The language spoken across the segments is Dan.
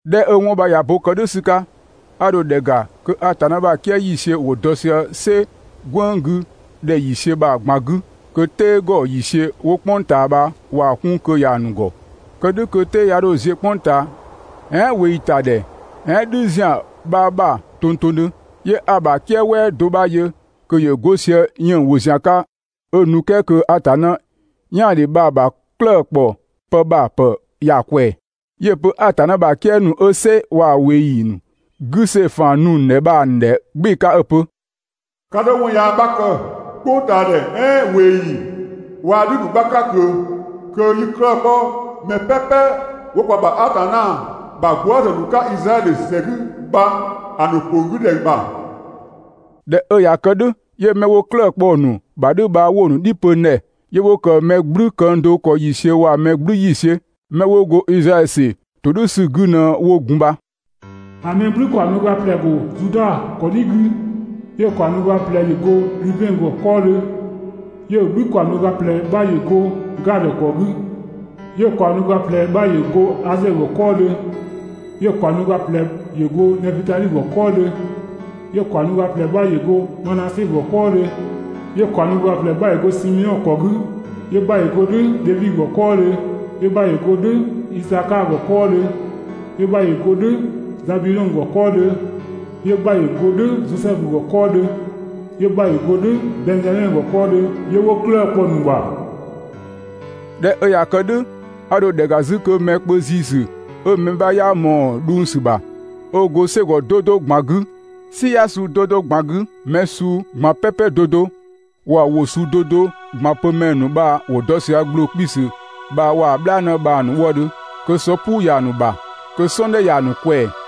꞊Dhɛ 'ö 'wɔn bha ꞊ya bo ‑kë "dhʋ̈ ‑sü 'ka, 'a dho ‑dhɛ ‑ga, kö Atanna ‑bha "kië ‑yiisiö ‑wo dɔ sië "sɛ "gwënng 'gü ‑dhɛ ‑yiisiö bha‑ ꞊gban 'gü, kö "tɛɛ ‑gɔ ‑yiisiö 'wo "kpʋng ꞊taa bha ꞊waa‑ 'kun kö ‑ya ‑nu ‑gɔ, Kë "dhʋ̈ kö "tɛɛ 'ya 'dho ziö "kpʋng ꞊taa, "ɛɛn ꞊weeyi ‑ta ‑dhɛ "ɛɛn "dhü ‑zian 'bha ‑bha tongtongdhö. 'Yö 'a‑ ‑bha "kië "wɛɛ do 'bha yö kö ‑yö 'go sië 'yënng‑ ‑wo ‑zian 'ka 'ö nu "kɛɛ kö Atanna "yaandhe bha‑ ‑bha 'klëë‑ ‑kpɔ pë ‑bha ‑pë ‑ya ꞊kwɛɛ‑. 'Yö‑ pö Atanna ‑bha "kië ‑nu 'ö "sɛ waa‑ ꞊weeyi ‑nu 'gü see‑ ‑faan nu‑ ‑nu ‑dhɛ bha‑ ‑nu ‑dhɛ "gbɩɩ‑ 'ka 'ö‑ pö: «'Ka 'dho 'wɔn yaa 'bha kë "kpʋngtaadhɛ "ɛɛn ꞊weeyi waa‑ "dhü ‑nu 'bha 'ka ꞊kö kö 'yi 'klëë‑ 'kpɔ mɛ "pɛpɛ 'wo kwa ‑bha Atanna ‑bha gwëëzë ‑nu 'ka Izraɛdhö ‑sɛ 'gü bha‑ ‑nu ‑kpong 'gü ‑dhɛ ‑bha.» ꞊Dhɛ 'ö ꞊ya kë "dhʋ̈, 'yö 'mɛ 'wo 'klëë‑ kpɔ‑ ‑nu ‑bha "dhʋ̈ bha 'wo‑ ‑nu "dhi pö n ‑dhɛ. 'Yö 'wo ‑kë mɛ "gblü këng do ‑kɔ ‑yiisiö waa‑ mɛ "gblü ‑yiisiö. 'Mɛ 'wo go Izraɛdhö ‑sɛ ‑todhʋ̈sü 'gü ꞊në 'wo gun bha. ‑A mɛ "gblü ‑kaɔng do ga ꞊plɛ‑ ‑go Zuda ‑kɔdhi 'gü, 'yö‑ ‑kaɔng do ga ꞊plɛ ‑yö go Dhubɛn ‑gɔ 'kɔɔdhö, 'yö‑ mɛ "gblü ‑kaɔng do ga ꞊plɛ 'bha ‑yö go Gadö ‑kɔ 'gü, 'yö‑ ‑kaɔng do ga ꞊plɛ 'bha ‑yö go Asɛɛ ‑gɔ 'kɔɔdhö, 'yö‑ ‑kaɔng do ga ꞊plɛ ‑yö go Nɛfutadhi ‑gɔ 'kɔɔdhö, 'yö‑ ‑kaɔng do ga ꞊plɛ 'bha ‑yö go Manase ‑gɔ 'kɔɔdhö, 'yö‑ ‑kaɔng do ga ꞊plɛ 'bha ‑yö go Simeɔn ‑kɔ 'gü, 'yö‑ 'bha ‑yö go "dhʋ̈ Dhevi ‑gɔ 'kɔɔdhö, 'yö‑ 'bha ‑yö go "dhʋ̈ Isakaa ‑gɔ 'kɔɔdhö, 'yö‑ 'bha ‑yö go "dhʋ̈ Zabidhɔng ‑gɔ 'kɔɔdhö, 'yö‑ 'bha ‑yö go "dhʋ̈ Zosɛfu ‑gɔ 'kɔɔdhö, 'yö‑ 'bha ‑yö go "dhʋ̈ Bɛnngzamɛ ‑gɔ 'kɔɔdhö, 'yö 'wo 'klëë‑ kpɔ‑ ‑nu ‑bha. ꞊Dhɛ 'ö ꞊ya kë "dhʋ̈, a ‑dho ‑dhɛ ‑ga 'zü kö mɛ kpö ‑ziisü 'ö mɛ 'bha 'yaa ꞊mɔɔ‑ dhʋng ‑sü ‑bha, 'ö go "sɛgɔ 'do 'do ꞊gban 'gü, "siya suu 'do 'do ꞊gban 'gü, mɛ suu ꞊gban "pɛpɛ 'do 'do, waa‑ ‑wʋ suu 'do 'do ꞊gban pö ‑mɛ ‑nu bha ‑wo dɔ sië ‑gbloo 'kpiisü bha waa‑ "bhlaanë bha‑ ‑nu wëëdhö, kö sɔ "puu ‑ya ‑nu ‑bha, kö "sɔɔndhɛ ‑ya ‑nu ꞊kwɛɛ‑.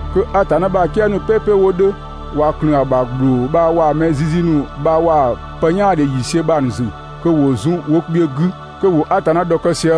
Kö Atanna ‑bha "kië ‑nu "pɛpɛ 'wo 'dhö, ꞊wa ꞊klëën‑ ‑bha ‑gbloo bha waa‑ mɛ zizi ‑nu bha waa‑ pë "yaandhe ‑yiisiö bha‑ ‑nu ‑zü. 'Yö 'wo zun wo kpiö 'gü, kö ‑wo Atanna ‑dhɔkë sië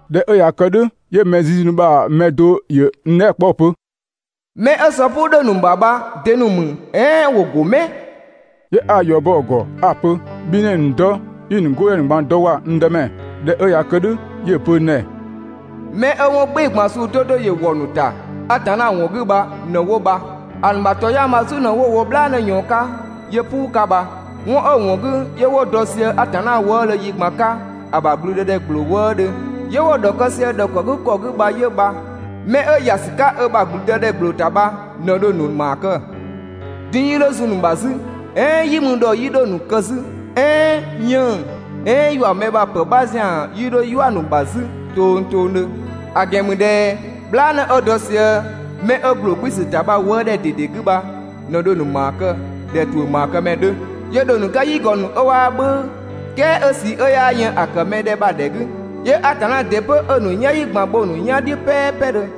꞊Dhɛ 'ö ꞊ya kë "dhʋ̈, 'yö mɛ zizi ‑nu bha‑ mɛ do ‑yö n dhɛɛ" kpɔ 'ö‑ pö: «'Mɛ 'ö sɔ "puu 'dhö‑ ‑nu ‑bha bha de‑ ‑nu ‑mü "ɛɛn ‑wo ‑go 'mɛ?» 'Yö 'a‑ ‑yɔ bɔ‑ ‑gɔ 'a‑ pö: «Bhi ꞊në 'i‑ ‑nu dɔ, 'i‑ ‑nu 'godhɛ ‑nu ꞊gban dɔ ‑wa n Dëmɛ.» ꞊Dhɛ 'ö ꞊ya kë "dhʋ̈ 'yö‑ pö n ‑dhɛ: «'Mɛ 'ö 'wɔn "gbɩɩ‑ ꞊gban suu 'do 'do ‑yö ‑wɔ ‑nu ‑ta Atanna ‑wɔn 'gü bha ꞊në 'wo bha. ‑A ‑nu ‑bha ‑tɔyang bha‑ "zu ꞊në 'wo‑ wo "bhlaanë ꞊yɔɔn 'ka 'yö "puu 'ka bha. 'Wɔn 'ö‑ ‑wɔn 'gü 'yö 'wo dɔ sië Atanna wëëdhö yi ꞊gban 'ka ‑a ‑bha ‑blüdëdhɛ ‑gbloo wëëdhö, 'yö 'wo‑ ‑dhɔkë sië‑ ‑dhɔkëgükɔ 'gü bha 'yö bha. 'Mɛ 'ö ‑ya ‑sü 'ka ö ‑bha ‑blüdëdhɛ ‑gbloo ‑ta bha ꞊në dho‑ ‑nu ‑maa kë. Din‑ 'yii 'dho zun‑ ‑nu ‑bha 'zü, "ɛɛn "yi mü ‑dhɔ 'yii 'dho‑ ‑nu kë 'zü, "ɛɛn 'yënng‑, "ɛɛn ‑yua mɛ ‑bha ‑pë 'bha ‑zian 'yii 'dho "yua‑ ‑nu ‑bha 'zü tongtongdhö. ‑A ‑gɛn ‑mü ꞊dhɛ "bhlaanë 'ö dɔ sië 'mɛ 'ö ‑gbloo 'kpiisü ‑ta bha‑ wëëdhɛ ꞊dede 'gü bha ꞊në dho‑ ‑nu ‑maa kë ꞊dhɛ ‑tuʋ̈ ‑maakëmɛ 'dhö, 'yö dho‑ ‑nu 'ka "yigɔ ‑nu 'ö 'waa "bhʋ̈ʋ̈, "kɛɛ 'ö ꞊sii 'ö 'yaa yën ‑a ‑kë mɛ ‑dhɛ bha‑ ‑dhɛ 'gü. 'Yö Atanna ‑dɩ 'pö 'ö‑ ‑nu "yanyi ꞊gban bho‑ ‑nu "yan "dhiʋ̈ "pɛɛpɛdhö.